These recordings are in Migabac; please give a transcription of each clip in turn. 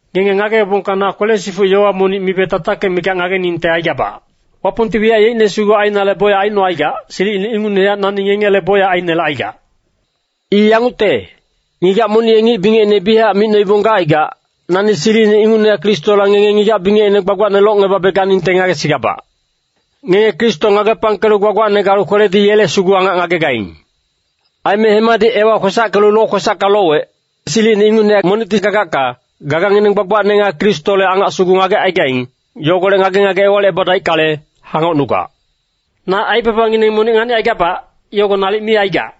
Ngenge ngageebongka na kwele-sifuc yowa monic mibe tatakic mikac ngageningte aigabac. Wapongti wiyac yeicne sugu ainale bocyac aicnocaigac, silicine ingucnehac nani ngengele bocyac ainelecaigac. I yangucte, ngigac monic ye ngic bingecine biyachac micnoibong gacaigac, nani silicine ingucnehac Kristola ngenge ngigac-bingecne gbagbacne locngebabe ganingte ngagesigabac. Ngenge Kristo ngagepangkelu gbagbacne galu kweledi yele sugu angac ngagegaing. Aime hemadi Ewa kwesackelu lokwesacka lowec. Silicine ingucnehac monicti gagacka, gagangineng gbagbacne nga Kristole angac sugu ngagecaigaing, yogolec ngage-ngage ewalicngebadaickale, hangocnugac. Na aibabangineng monic nganicaigabac, yogo nalic mi aigac.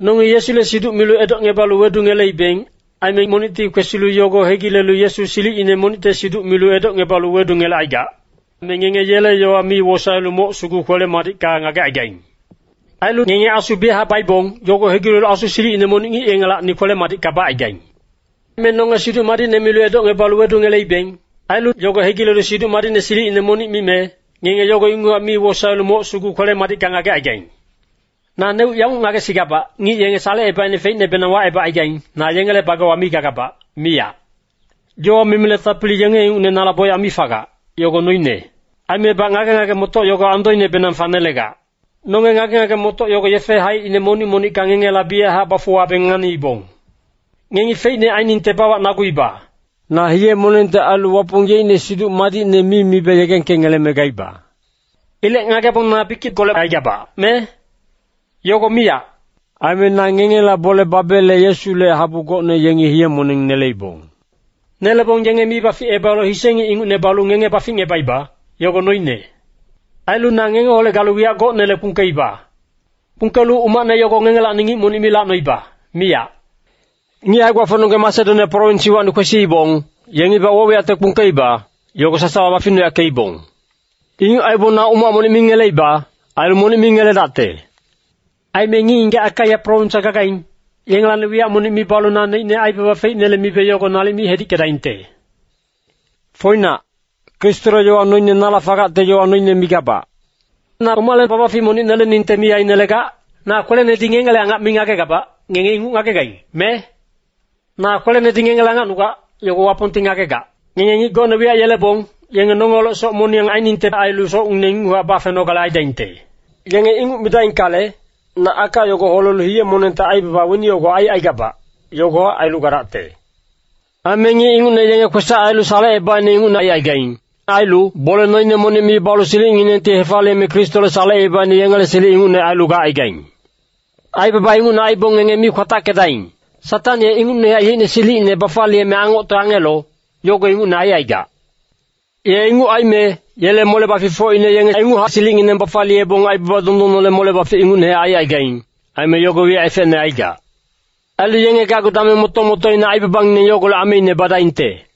Nongi Yesule siduc milu edocngebalu wedungeleibeng. Aime monicti kwesilu yogo hegilelu Yesu silicine monicte siduc milu edocngebalu wedungelecaigac. Me ngenge yele yowa mi wosaelu moc sugu kwele-madicka ngagecaigaing. Ailu ngenge Asu biyachac baibong, yogo hegilelu asu silicine monic ngic yengelacni kwele-madicka bacaigaing. Me nonge Siduc Madicne milu edocngebalu wedungeleibeng. Ailu yogo hegilelu siduc madicne silicine monic mime, ngenge yogo inguchac mi wosaelu moc sugu kwele-madicka ngagecaigaing. Naneuc yanguc ngagesigabac, ngic yenge salecebaicne feicnebenang wacebagaing, na yengele bagewa mi gagabac, miyac. Yowa mimile tapili yenge ingucne nala bocyac mi fagac, yogo noine. Aimebac ngage-ngage-motoc yogo andoinebenang fanelegac. Nonge ngage-ngage-motoc yogo yefe haicine monic-monicka ngengela biyachac bafuwabeng nganiibong. Ngengi feicne ainingte bawacnaguiba. Na hiye-monengte ailu Wapong yeicne Siduc Madicne mi mibe yegengkengeleme gaiba. Ilec ngagebong na bikickolec aigabac, me? Yogo miyac! Aime na ngengela bole babele Yesule habu gocne yengi hiye-moneng neleibong. Nelebong yenge mi baficebalu hise ngic ingucne balu ngenge baficngebaiba, yogo noine. Ailu na ngengeholec galu wiyac gocnele kpungkeiba. Kpungkelu umacne yogo ngengelacni ngic monic mi lacnoiba, miyac. Ngic hae-gbafocnonggeng Masedonia prowins iwacni kwesiibong, yengibac woc-wiyacte kpungkeiba, yogo sasawa baficnuyackeibong. Inguc aibong na umac monic mi ngeleiba. Ailu monic mi ngeledacte. Aime ngic-ngigac Akaia prowinswa gagaing, yengelacni wiyac monic mi balu naneicne aibaba feicnele mibe yogo nalic mi hedickedaingte. Foinac, Kristole yowa noine nala fagacte yowa noine migabac. Na omale babafic monic neleningte mi ainelegac? Na kwelenedi ngengele angac mi ngagegabac, ngenge inguc ngagegaing, me? Na kwelenedi ngengele angacnugac, yogo Wapongti ngagegac. Ngenge ngic gocne wiyac yelebong, yenge nongeholec soc moniyang ainingte ailu socngineng inguchac bafenogale aidaingte. Yenge inguc midaingkale, na aka yogo holelu hiye-monengte aibaba weni yogo aicaigabac, yogohac ailu gadacte. Aime ngic ingucne yenge kwesac ailu salecebaicne ingucne aicaigaing. Ailu bole noine monic mi balu silicnginengti hefaliyeme Kristole salecebaicne yengele silic ingucne ailu gacaigaing. Aibaba ingucne aibong ngenge mi kwatackedaing. Satang ye ingucnehac yeicne silicine bafaliyeme angocte angelo, yogo ingucne aicaigac. Ye inguc aime, yele mole-baficfocine yenge inguchac silicngineng bafaliyebong aibaba dondonnele mole-bafic, ingucnehac aicaigaing. Aime yogo wiyac efecne aigac. Ailu yenge gacgu dameng moto-motoina aibabangineng yogolec ameine badaingte.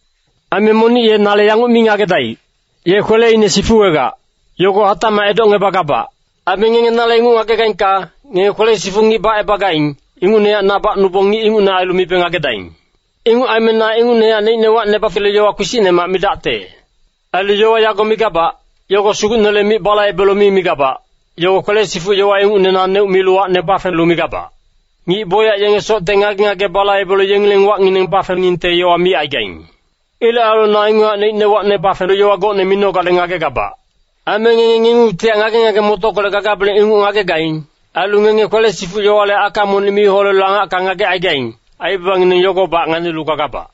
Aime monic ye nale yanguc mi ngagedaic, “Ye kweleine sifuwegac.” Yogo hatacmac edocngebagabac. Ailu ngenge nale inguc ngagegaingka, ngenge kwele-sifuc ngic bacebagaing, ingucnehac na bacnubong ngic ingucne ailu mibe ngagedaing. Inguc aime na inguchac neicne wacne bafelu yowa kpisicnemac midacte. Ailu yowa yago migabac, yogo Sugucnele mic balaibelu mi migabac, yogo kwele-sifuc yowa ingucne naneuc milu wacne bafelu migabac. Ngic bocyac yenge socte ngage-ngage balaibelu yengileng wacngineng bafeningte yowa micaigaing. Ilec ailu na inguchac neicne wacne bafelu yowa gocne minogale ngagegabac. Aime ngenge ngengungtihac ngage-ngage-motockolec gagabeleng inguc ngagegaing. Ailu ngenge kwele-sifuc yowale aka monic mi holelu angacka ngagecaigaing, aibabangineng yogobac nganilu gagabac.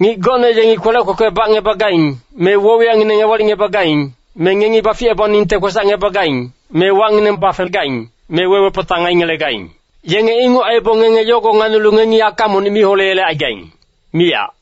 Ngic gocne yengi kwelec kwekwe bacngebagaing, me woc-wiyacngineng ewalicngebagaing. Me ngengi baficebaningte kwesacngebagaing, me wacngineng bafegaing, me we-wepatang aingelegaing. Yenge inguc aibong ngenge yogo nganilu ngengi aka monic mi holeyelecaigaing, miyac.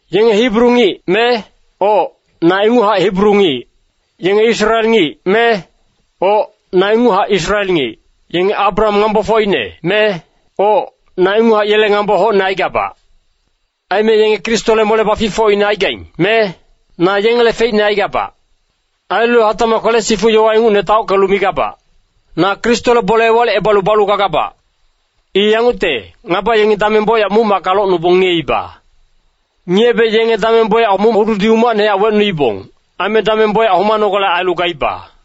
Yenge Hibru ngic, me? Oc, na inguchac Hibru ngic. Yenge Israel ngic, me? Oc, na inguchac Israel ngic. Yenge Abraham ngambofocine, me? Oc, na inguchac yele ngambo hocne aigabac. Aime yenge Kristole mole-baficfocine aigaing, me? Na yengele feicne aigabac. Ailu hatacmac kwele-sifuc yowa ingucne taockelu migabac. Na Kristole bole ewalicebalu balu gagabac. I yangucte, ngaba yengi dameng bocyac muc-macka locnubong ngiyeiba. Ngiyebe yenge dameng bocyac muc-hududi umacnehac wecnuibong. Aime dameng bocyac homanogale ailu gaiba.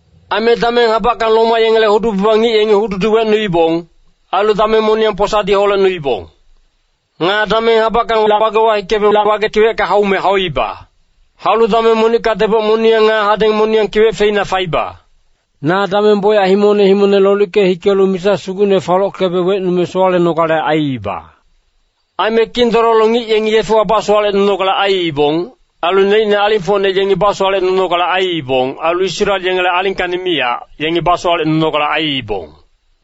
Ailu dameng habackang Roma yengele hudu-baba ngic yengi hududi wecnuibong. Ailu dameng moniyang posadi holecnuibong. Nga dameng habackang lac-wagewa hikebe lac-wage kiwecka haume hauiba. Haulu dameng monicka deboc moniyang nga hadeng moniyang kiwec feina faiba. Na dameng bocyac himongne himongne lolicke hikelu misa sugucne falockebe wecnume sowalenogale aiiba. Aime kindololo ngic yengi yefewa basowalecnunogale aiibong. Ailu neicne alingfocne yengi basowalecnunogale aiibong. Ailu Israel yengele alingkacni miyac, yengi basowalecnunogale aiibong.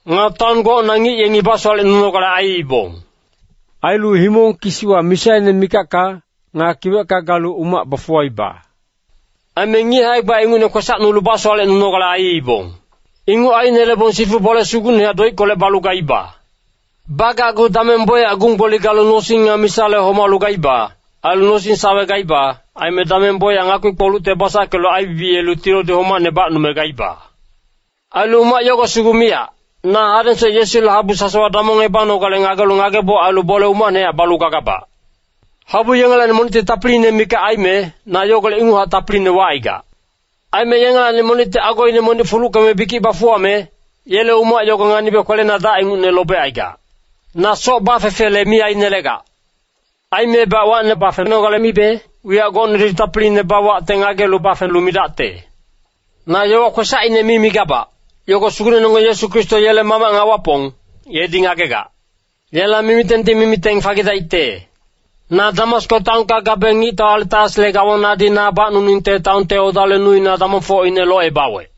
Nga taon gocna ngic yengi basowalecnunogale aiibong. Ailu himong kisiwa misaine mikacka, nga kiwecka galu umac bafuwaiba. Aime ngic hae-gba ingucne kwesacnulu basowalecnunogale aiibong. Inguc ainelebong sifu bole sugucnehac doickolec balu gaiba. Bagacgu dameng bocyac gung-gboli galu nosing nga misale homalu gaiba. Ailu nosing-sawe gaiba. Aime dameng bocyac ngakpi-kpolucte basackelu aibibiyelu tilodi homacne bacnume gaiba. Ailu umac yogo sugu miyac, na hadengsoc Yesule habu sasawa damongebanogale ngagelu ngageboc ailu bole umacnehac balu gagabac. Habu yengelacni monicti tapili mikac aime, na yogolec inguchac tapiline wacaigac. Aime yengelacni monicti agoine monic fuluckeme bikic bafuwame, yele umac yogo nganibe kwelena dac ingucne lobecaigac. Na soc bafefele mi ainelegac. Aimebac wacne bafenogale mibe, wiyac gocnedi tapiline bawawecte ngagelu bafelu midacte. Na yowa kwesacine mi migabac, yogo Sugucnenonggeng Yesu Kristo yele Mamac nga Wapong, yedi ngagegac. Yela mimitengti mimiteng fagidaicte. Na Damasko taonka gabe ngictau Aretasle gawanadi na bacnuningte taonte odale nuina damongfocine locebawec.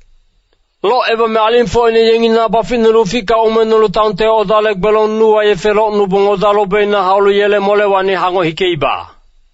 Locebame alingfocne yengi na baficnulu uficka umengnulu taonte odale gbelong nuwa yefe locnubong oda lobina haulu yele molewacni hangoc hikeiba.